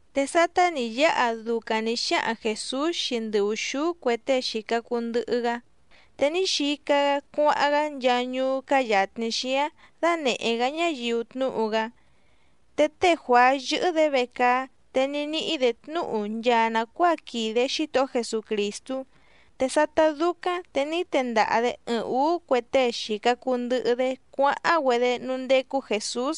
Te sátá nǐ yáha ducaⁿ nǐ xáhaⁿ Jèsús xii ndɨ ùxúú cue tée xìca cuu ndɨhɨ‑gá, te ní xica‑gá cuáháⁿ‑gá nchaa ñuú cáá yàtni xíáⁿ dánèhé‑gá ñáyiu tnúhu‑gá. Te té Juàá yɨ̀hɨ‑dé vecaá te ní níhí‑dě tnúhu nchaa nàcuáa quìde Xítohó Jesucrìstú. Te sátá dúcáⁿ te ní tendaha‑dě ɨɨⁿ ǔú cue tée xìca cuu ndɨhɨ‑dé cuáháⁿ‑güedé núú ndécú Jèsús.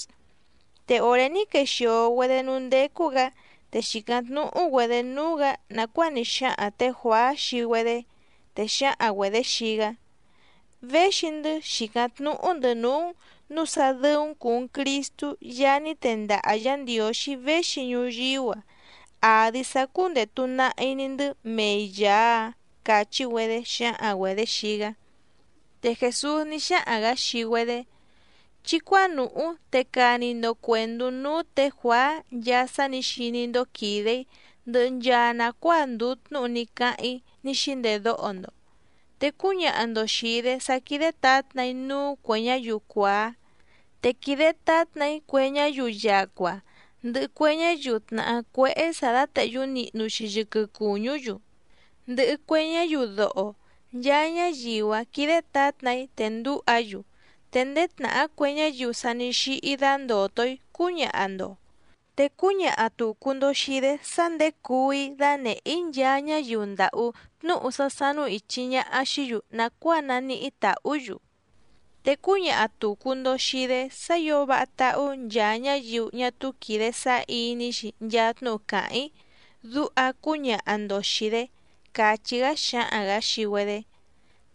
Te òré ní quexìo‑güedé núú ndécú‑gǎ, te xìcáⁿ tnúhú‑güedě núú‑gǎ nàcuáa ní xáhaⁿ tě Juàá xii‑güedé, te xǎhaⁿ‑güedě xii‑gá: —Véxi‑ndɨ́ xìcáⁿ tnúhú‑ndɨ̌ núú‑n nǔu sá dɨ́ú‑n cùu‑n Cristú Yaá ní tendaha Yǎ Ndiǒxí véxi ñuyíú‑a, àdi sá cúndètu nahi‑ni‑ndɨ́ mei Yàá‑áⁿ —càchí‑güedé xǎhaⁿ‑güedě xii‑gá. Te Jèsús ní xáhaⁿ‑gǎ xii‑güedé: —Chí cuánùhú te cani‑ndo cuèndú núú tě Juàá nchaa sá nǐ xiní‑ndó quìde‑í, ndɨhɨ nchaa nàcuáa ndùu tnúhu ní cáháⁿ‑í ní xíndedóho‑ndo. Te cúñaha‑ndo xìi‑dé sá quídé tǎtna‑í núú cuè ñáyiu cuàá, te quìde tátna‑í cue ñáyiu yacua, ndɨhɨ cue ñáyiu tnàhá cuéhé sǎ dátèhyú nihnu‑xi yɨquɨ cùñú‑yu, ndɨhɨ cue ñáyiu doho, nchaa ñáyiu‑áⁿ quídé tǎtna‑í, te ndǔha‑yu, te ndéé tnàhá cue ñáyiu sa ní xíhí dándòto‑í cúñaha‑ndo. Te cúñaha tùcu‑ndo xii‑dé sá nděcuu‑í dánèhé‑í nchaa ñáyiu ndàhú, tnúhu sá sánú ìchi ñaha xií‑yu nàcuáa naníhí tàhú‑yu. Te cúñaha tùcu‑ndo xii‑dé sá ǐo váha táhú nchaa ñáyiu ñá túú quìde sáá iní‑xi nchaa tnúhu càháⁿ‑í, duha cúñaha‑ndo xìi‑dé —càchí‑gá xǎhaⁿ‑gǎ xii‑güedé.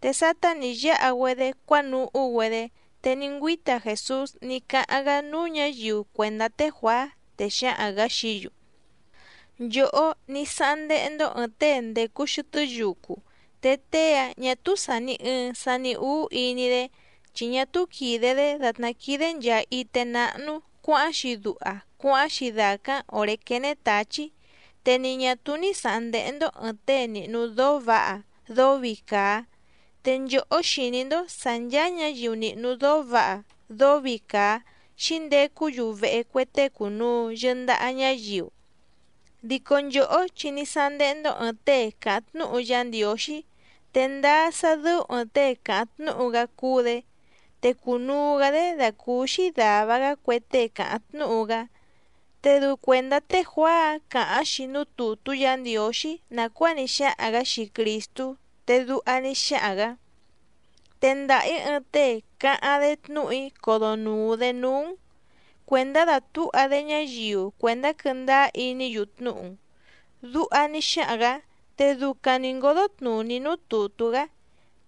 Te sátá nǐ yáha‑güedé cuánuhú‑güedé te ní ngüíta Jèsús ní cáháⁿ‑gá núú ñǎyiu cuèndá té Juàá, te xǎhaⁿ‑gǎ xií‑yu: —Nchòhó ní sáháⁿ ndéhé‑ndó ɨ̀ɨⁿ tée ndècu xɨtɨ́ yucu, te tée‑áⁿ ñà túú sàni ɨɨⁿ sani úú iní‑dé, chi ñá túú quìde‑dé dàtná quídé nchàa ité náhnú cuǎháⁿ‑xi duha cuáháⁿ‑xi dàcáⁿ òré quéné tǎchí. Te ni ñà túú ní sǎháⁿ ndéhé‑ndó ɨ̀ɨⁿ tée nìhnu dóó vǎha dóó vii càa. Te nchòhó xìní‑ndó sǎ ncháá ñǎyiu nìhnu dóó vǎha dóó vii càa xíndecú‑yu vehe cue tée cùnuu yɨndaha ñáyiu. Dico nchòhó chi ní sándéhé‑ndó ɨ̀ɨⁿ tée càháⁿ tnúhu Yá Ndiǒxí, te ndáá sá dɨ́ú ɨ̀ɨⁿ tée càháⁿ tnúhu‑gá cúú‑dě, te cùnuu‑gá‑dé dàcúúxí dàva‑gá cue tée càháⁿ tnúhu‑gá. Te dɨu cuèndá té Juàá‑áⁿ càháⁿ‑xi núú tùtú Yǎ Ndiǒxí nàcuáa ní xáhaⁿ‑gǎ xii Crìstú, te duha ní xáhaⁿ‑gǎ: Tendaha‑ǐ ɨɨⁿ tée cáháⁿ‑dé tnúhu‑í codonùu‑dé núú‑n, cuèndá dàtúha‑dé ñáyiu cuèndá quɨ́ndáá iní‑yu tnúhu‑n. Duha ní xáhaⁿ‑gǎ, te ducaⁿ nǐ ngódó tnùní núú tùtú‑gá.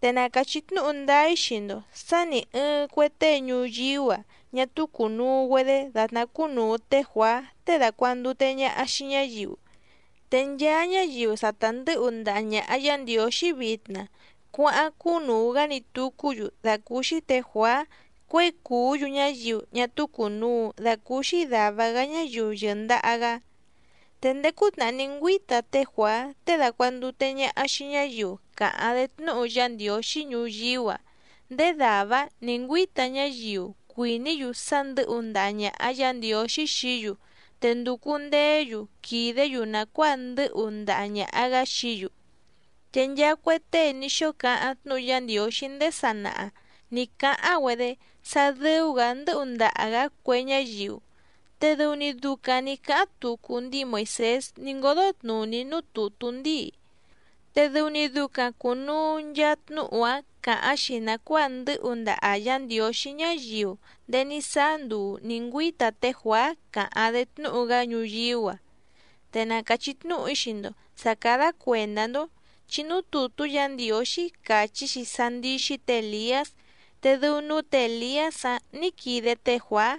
Te na càchí tnúhu ndáá‑í xii‑ndo sǎ nì ɨɨⁿ cue tée ñuyíú‑a ñá túú cùnuu‑güedé dàtná cúnùu té Juàá tée dàcuandute ñaha xii ñáyiu. Te nchaa ñáyiu sa ta ndɨ̌hu ndaha ñàha Yá Ndiǒxí vitna cuáháⁿ cúnùu‑gá‑ni tucú‑yu dàcúúxí tě Juàá cuěi cùú‑yu ñáyiu ñá túú cùnuu dacúúxí dàva‑gá ñáyiu yɨ̀ndaha‑gá. ’Te ndéé cútnàhá ní ngüíta té Juàá tée dàcuandute ñaha xii ñáyiu càháⁿ‑dé tnúhu Yá Ndiǒxí ñuyíú‑a, ndéé dàvá‑áⁿ nǐ ngüíta ñáyiu cuìní‑yu sá ndɨ̌hu ndaha ñàha Yá Ndiǒxí xií‑yu te ndùcu ndeé‑yu quìdé‑yu nàcuáa ndɨ́hu ndaha ñàha‑gá xií‑yu. Te nchaa cue tée ní xóo cáháⁿ tnúhu Yá Ndiǒxí ndéé sanaha nǐ cáháⁿ‑güedé sá dɨ́ú‑gǎ ndɨ́hu ndaha‑gǎ cue ñáyiu, te dɨu‑ni ducaⁿ nǐ cáháⁿ tucu ndíi Moìsés ní ngódó tnùní núú tùtú ndíi. Te dɨu‑ni ducaⁿ cùnuu nchaa tnúhu‑áⁿ càháⁿ‑xi nàcuáa ndɨ́hu ndaha Yǎ Ndiǒxí ñáyiu ndéé ní sáá nduu nǐ ngüíta té Juàá càháⁿ‑dé tnúhu‑gá ñuyíú‑a. Te na càchí tnúhu‑í xii‑ndo sǎ cádá cuèndá‑ndó, chi núú tùtú Yǎ Ndiǒxí càchí‑xi sá ndíxí tě Èliás, te dɨu núú tě Èliás‑áⁿ nǐ quide té Juàá.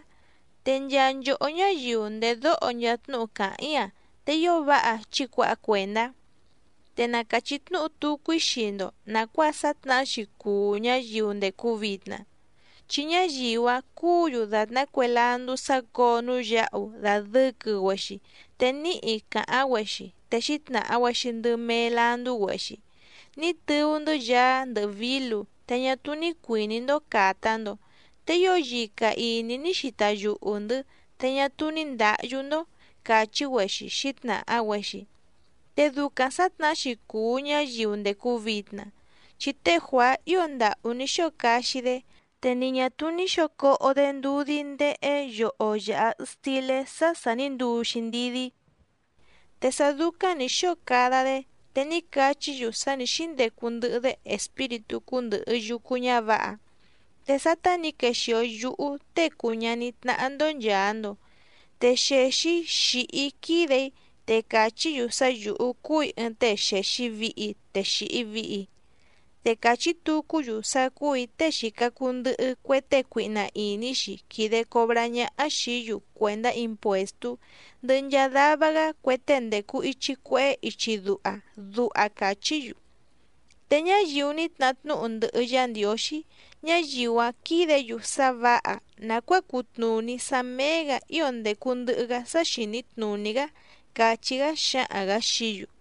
Te nchaa nchòhó ñáyiu ndèdóho nchaa tnúhu càháⁿ‑í‑a te ío váha chí cuǎha cuèndá. ’Te na càchí tnúhu tucu‑í xii‑ndo nàcuáa sǎtnahá‑xi cùu ñáyiu ndècu vitna. Chi ñáyiu‑áⁿ cúǔ‑yu dàtná cue landú sácǒo núú yǎhu dàdɨquɨ‑güexi te níhi càháⁿ‑güexi, te xǐtnàha‑güexi ndɨ mee landú‑güexi: “Ní tɨú‑ndɨ́ yaá ndɨhɨ vǐlu te ñá túú ní cuìní‑ndó càta‑ndo. Te ío yica ìní ní xita yuhu‑ndɨ̌ te ñá túú ní ndǎhyú‑ndó”, càchí‑güexi xǐtnàha‑güexi. Te ducaⁿ sǎtnahá‑xi cùu ñáyiu ndècu vitna, chi té Juàá ío ndàhú ní xóo caxi‑dé, te ni ñà túú ní xǒo coho‑dé ndudí ndéhé yoho yàha stilé sá sà ní nduu‑xi ndidí, te sá dúcáⁿ nǐ xóo cada‑dé te ní cachí‑yu sá nǐ xíndecu ndɨhɨ‑dé espíritú cúndɨ̀hɨ yucu ñávǎha. Te sátá nǐ quexìo yúhú Tée cùu ñaní tnáhá‑ndó nchàa‑ndo, te xèxi‑í xìhi‑í quídè‑í, te càchí‑yu sá yǔhú cúù‑í ɨɨⁿ tée xèxi vihi te xìhi vihi, te càchí tucú‑yu sá cúù‑í tée xìca cuu ndɨhɨ cue tée cuihna ìní‑xi quìde cobrá ñáhá xìí‑yu cuèndá impuèstú ndɨhɨ nchaa dava‑gá cue tée ndècu ichi cuehé ichi duha, duha càchí‑yu. Te ñáyiu ní tnahá tnúhu ndɨhɨ Yá Ndiǒxí, ñáyiu‑áⁿ quídě‑yu sá vǎha nàcuáa cutnùní sá méé‑gǎ ío ndècu ndɨhɨ‑gá sá xìní tnùní‑gá —càchí‑gá xǎhaⁿ‑gǎ xií‑yu.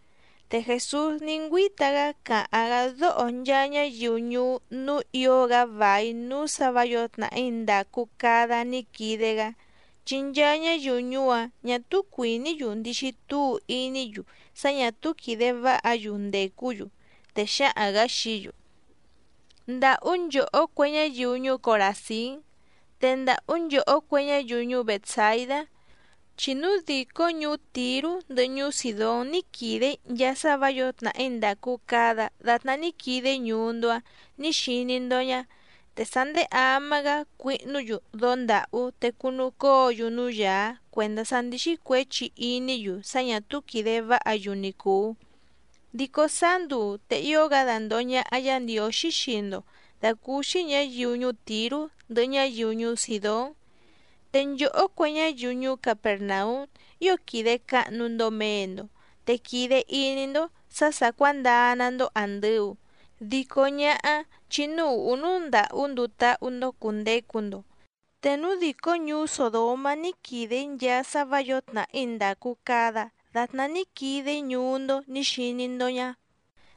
Te Jèsús ní ngüíta‑gá càháⁿ‑gá dóho nchaa ñáyiu ñuú núú ǐo‑gá vài núú sǎ vǎ yǒo tnàhí ndàcu cada ní quide‑gá, chi nchaa ñáyiu ñuú‑áⁿ ñà túú cuìní‑yu ndixi túu iní‑yu sá ñà túú quìde váha‑yu ndècú‑yu, te xǎhaⁿ‑gǎ xií‑yu: —¡Ndàhú nchòhó cue ñáyiu ñuú Coràzín! ¡Te ndàhú nchòhó cue ñáyiu ñuú Bètsaidá! Chi núu dìcó ñuú Tìrú ndɨhɨ ñuú Sìdón ní quìde‑í nchaa sá vǎ yǒo tnàhí ndàcu cada datná ní quide‑í ñuú‑ndó‑á nǐ xiní‑ndó ñá, te sá ndéé ama‑gá cuihnú‑yu dóó ndàhú te cunu cóo‑yu núú yàá cuèndá sá ndíxí cuěchi iní‑yu sá ñà túú quìde váha‑yu ni cùu. Dico sáá nduu te ío‑gá dandòho ñaha Yá Ndiǒxí xii‑ndo dàcúúxí ñǎyiu ñuú Tìrú ndɨhɨ ñáyiu ñuú Sìdón. Te nchòhó cue ñáyiu ñuú Capèrnaúm ío quìde cahnu‑ndo mee‑ndo, te quìde iní‑ndó sǎ sà cuándaa‑ná‑ndó àndɨu, dico ñáhá chi núú ùhú núú ndàhú nduu táhú‑ndó cùndecu‑ndo. Te núu dìcó ñuú Sòdomá ní quìde‑í nchaa sá vǎ yǒo tnàhí ndàcu cada datná ní quide‑í ñuú‑ndó nǐ xiní‑ndó ñá,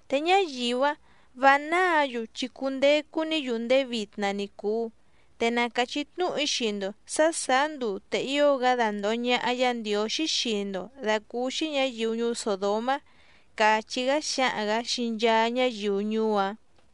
te ñáyiu‑áⁿ vǎ náǎ‑yu chi cundecu‑ní‑yu ndéé vitna ni cùu. Te na càchí tnúhu‑í xii‑ndo sǎ sàá nduu te ío‑gá dandòho ñaha Yá Ndiǒxí xii‑ndo dàcúúxí ñǎyiu ñuú Sòdomá —càchí‑gá xǎhaⁿ‑gǎ xii nchaa ñáyiu ñuú‑áⁿ.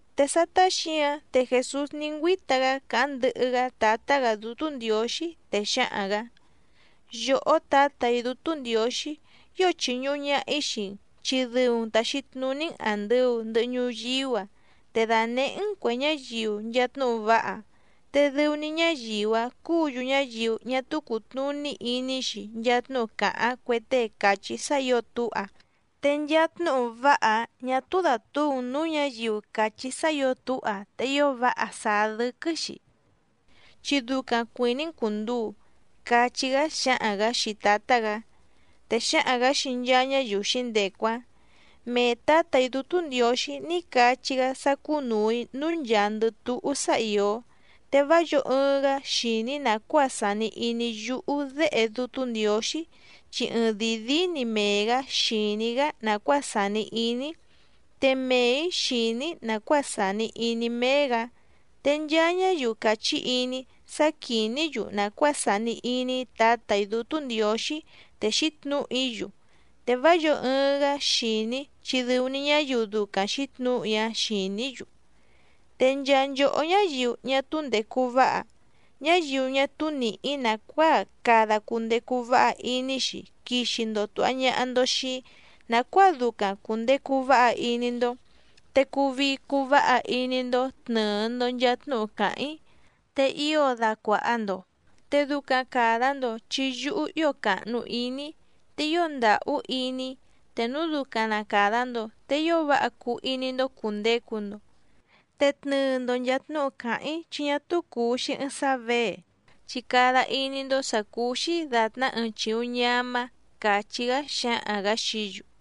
Te sátá xǐǎⁿ te Jèsús ní ngüíta‑gá càháⁿ ndɨhɨ‑gá Tǎtá‑gǎ Dútú Ndiǒxí, te xǎhaⁿ‑gǎ: —Yòhó Tǎtà‑í Dútú Ndiǒxí, ío chìñuhu ñaha‑í xii‑n chi dɨu‑n tàxi tnuní‑n àndɨu ndɨhɨ ñuyíú‑a, te dànehé‑n cuè ñáyiu nchaa tnúhu váha, te dɨu‑ni ñáyiu‑áⁿ cúǔ‑yu ñáyiu ñá túú cùtnuní iní‑xi nchaa tnúhu càháⁿ cue tée càchí sá ǐo túha, te nchaa tnúhu váha‑áⁿ ñà túú dàtúu‑n nǔú ñǎyiu càchí sá ǐo túha te ío váha sàá dɨ́quɨ́‑xi. Chi ducaⁿ cuìní‑n cùnduu —cachí‑gá xǎhaⁿ‑gǎ xii Tǎtá‑gǎ. Te xǎhaⁿ‑gǎ xii nchaa ñáyiu xǐndecu‑áⁿ: —Mee Tǎtà‑í Dútú Ndiǒxí ní cachí‑gá sá cúnùu‑í núú nchàandɨ túhú sá ìó. Te vá yǒo ɨɨⁿ‑gá xìní nàcuáa sàni iní yúhú Déhe Dútú Ndiǒxí, chi ɨɨⁿdìi díí‑ni mee‑gǎ xìní‑gá nàcuáa sàni iní‑í, te mee‑ǐ xìní‑í nàcuáa sàni iní méé‑gǎ. Te nchaa ñáyiu càchí iní‑í sá quìní‑yu nàcuáa sàni iní Tǎtà‑í Dútú Ndiǒxí te xǐtnǔhu‑í‑yu, te vá yǒo ɨɨⁿ‑gá xìní chi dɨu‑ni ñáyiu ducaⁿ xǐtnǔhu‑í‑áⁿ xìní‑yu. Te nchaa nchòhó ñáyiu ñá túú ndècu váha, ñáyiu ñá túú nìhí nàcuáa cada cundecu váha iní‑xi quixi‑ndo tùha ñaha‑ndo xii‑í nàcuáa ducaⁿ cùndecu váha iní‑ndó. Te cuu vii cuu váha iní‑ndó tnɨ̀ɨ‑ndo nchaa tnúhu càháⁿ‑í, te ío dacuàha‑ndo, te ducaⁿ càda‑ndo chi yúhú ío càhnu iní‑í, te ío ndàhú iní‑í. Te núu ducaⁿ na càda‑ndo te ío váha cuu iní‑ndó cùndecu‑ndo. Te tnɨɨ‑ndo nchàa tnúhu càháⁿ‑í chi ñá túú cùu‑xi ɨɨⁿ sá věe, chi cada iní‑ndó sǎ cúú‑xí dàtná ɨɨⁿ chìuⁿ ñamá —càchí‑gá xǎhaⁿ‑gǎ xií‑yu.